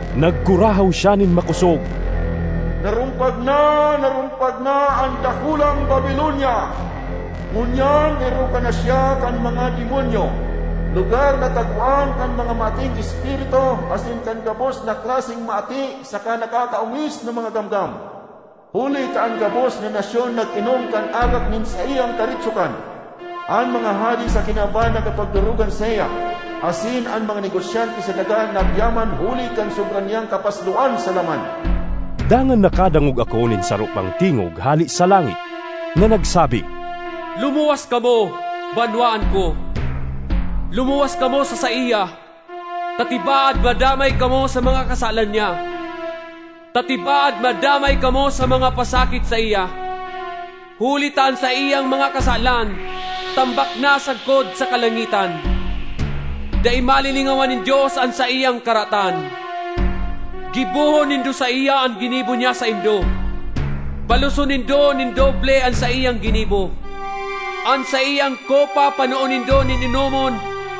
Nagkurahaw siya nin makosog, “Narumpag na, narumpag na an dakulang Babilonia! Ngunyan erokan na siya kan mga demonyo, lugar na tagoan kan mga maating espiritu asin kan gabos na klaseng maati saka nakakaongis na mga gamgam. Huli ta an gabos na nasyon nag-inom kan arak nin saiyang karigsokan. An mga hade sa kinaban nakipagdorogan saiya asin an mga negosyante sa daga nagyaman huli kan sobra niyang kapasloan sa laman.” Dangan nakadangog ako nin saro pang tingog hale sa langit na nagsabi, “Lumuwas kamo, banwaan ko! Lumuwas kamo sa saiya, ta tibaad madamay kamo sa mga kasalan niya, ta tibaad madamay kamo sa mga pasakit saiya. Huli ta an saiyang mga kasalan tambak na sagkod sa kalangitan, dai malilingawan nin Dios an saiyang karatan. Gibohon nindo saiya an ginibo niya saindo; baloson nindo nin doble an saiyang ginibo. An saiyang kopa panoon nindo nin inomon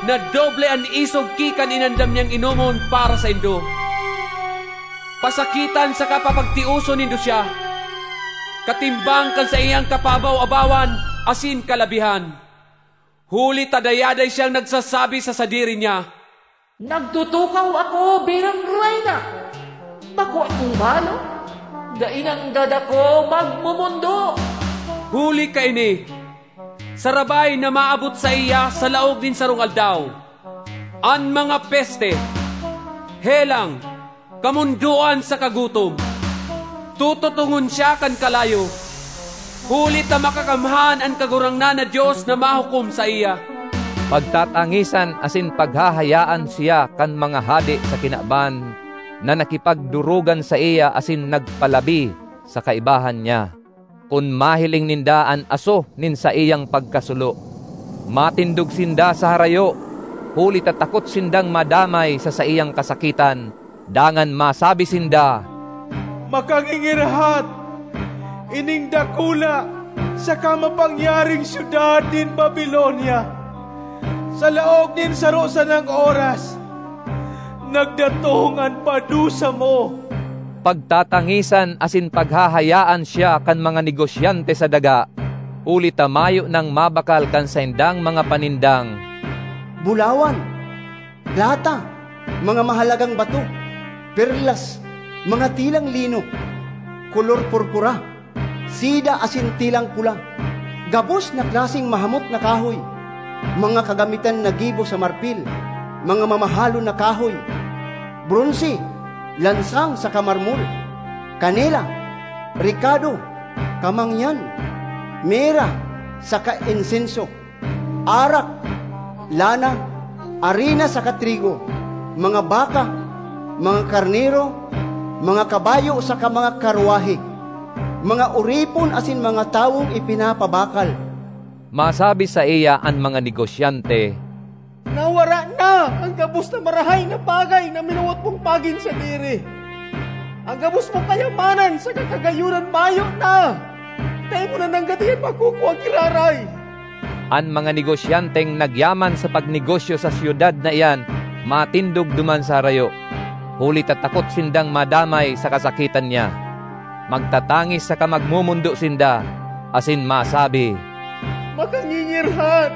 na doble an isog ki kan inandam niyang inomon para saindo. Pasakitan saka papagtioson nindo siya, katimbang kan saiyang kapaabaw-abawan asin kalabihan. Huli ta dayaday siyang nagsasabi sa sadiri niya, ‘Nagtutukaw ako bilang reyna! Bako akong balo, dai nanggad ako magmomondo!’ Huli kaini, sarabay na maabot saiya, sa laog nin sarong aldaw, an mga peste: helang, kamondoan saka gutom. Tututongon siya kan kalayo, huli ta makakamhan an Kagurangnan na Dios na mahukom saiya.” Pagtatangisan asin paghahayaan siya kan mga hade sa kinaban na nakipagdorogan saiya asin nagpalabi sa kaibahan niya, kun mahiling ninda an aso nin saiyang pagkasulo. Matindog sinda sa harayo, huli ta takot sindang madamay sa saiyang kasakitan, dangan masabi sinda, “Makangingirhat! Ining dakula saka mapangyaring syudad nin Babilonia! Sa laog nin saro sanang oras nagdatong an padusa mo!” Pagtatangisan asin paghahayaan siya kan mga negosyante sa daga, huli ta mayo nang mabakal kan saindang mga panindang bulawan, plata, mga mahalagang bato, perlas, mga telang lino, kolor purpura, seda asin telang pula; gabos na klaseng mahamot na kahoy, mga kagamitan na gibo sa marpil, mga mamahalon na kahoy; bronse, lansang saka marmol; kanela, rekado, kamangyan, mira saka insenso; arak, lana, arina saka trigo; mga baka, mga karnero, mga kabayo saka mga karwahe; mga oripon asin mga tawong ipinapabakal. Masabi saiya an mga negosyante, “Nawara na an gabos na marahay na bagay na minawot mong magin sadiri; an gabos mong kayamanan saka kagayonan mayo na, dai mo na nanggad iyan makukua giraray!” An mga negosyanteng nagyaman sa pagnegosyo sa syudad na iyan matindog duman sa harayo, huli ta takot sindang madamay sa kasakitan niya. Magtatangis saka magmomondo sinda, asin masabi, “Makangingirhat!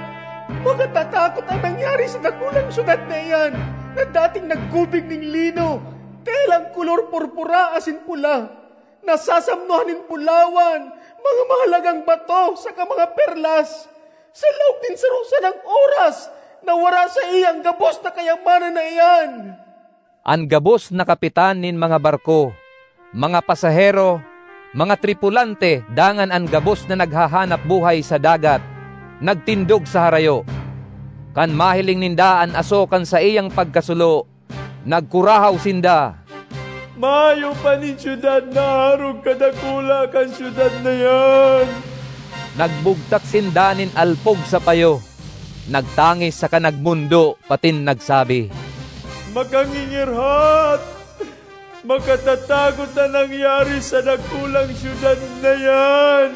Makatatakot an nangyari sa dakulang syudad na iyan na dating naggubing nin lino, telang kolor purpura asin pula, nasasamnohan nin bulawan, mga mahalagang bato, saka mga perlas! Sa laog nin saro sanang oras nawara saiya an gabos na kayamanan na iyan!” An gabos na kapitan nin mga barko, mga pasahero, mga tripulante dangan an gabos na naghahanap-buhay sa dagat nagtindog sa harayo; kan mahiling ninda an aso kan saiyang pagkasulo, nagkurahaw sinda, “Mayo pa nin syudad na arog kadakula kan syudad na iyan!” Nagbugtak sinda nin alpog sa payo, nagtangis saka nagmondo patin nagsabi, “Makangingirhat! Makatatakot an nangyari sa dakulang syudad na iyan,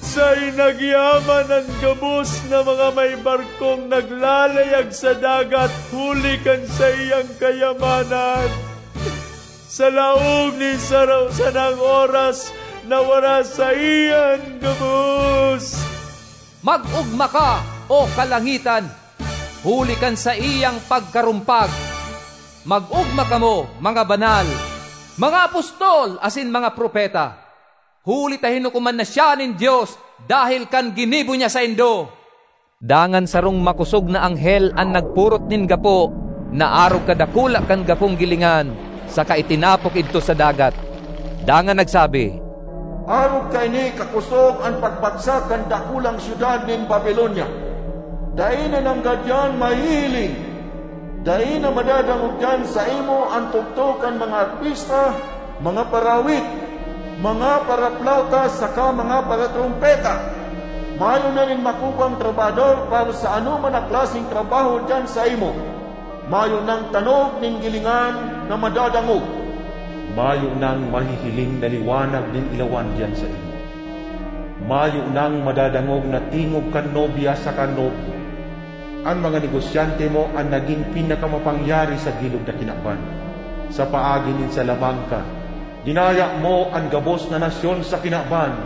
saen nagyaman an gabos na mga may barkong naglalayag sa dagat huli kan saiyang kayamanan! Sa laog nin saro sanang oras nawara saiya an gabos!” Mag-ogma ka, O kalangitan, huli kan saiyang pagkarumpag! Mag-ogma kamo, mga banal, mga apostol asin mga propeta, huli ta hinukoman na siya nin Dios dahel kan ginibo niya saindo! Dangan sarong makosog na anghel an nagpurot nin gapo na arog kadakula kan gapong gilingan saka itinapok idto sa dagat, dangan nagsabi, “Arog kaini kakosog an pagbagsak kan dakulang syudad nin Babilonia; dai na nanggad iyan mahihiling. Dai na madadangog diyan saimo an tugtog kan mga arpista, mga paraawit, mga paraplawta saka mga paratrompeta! Mayo na nin makukuang trabahador para sa anoman na klaseng trabaho diyan saimo; mayo nang tanog nin gilingan na madadangog! Mayo nang mahihiling na liwanag nin ilawan diyan saimo; mayo nang madadangog na tingog kan nobya saka nobyo. An mga negosyante mo an nagin pinakamapangyari sa bilog na kinaban; sa paagi nin salamangka, dinaya mo an gabos na nasyon sa kinaban!”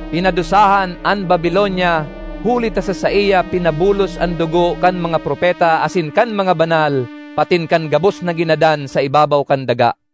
Pinadusahan an Babilonia huli ta sa saiya pinabulos an dugo kan mga propeta asin kan mga banal patin kan gabos na ginadan sa ibabaw kan daga.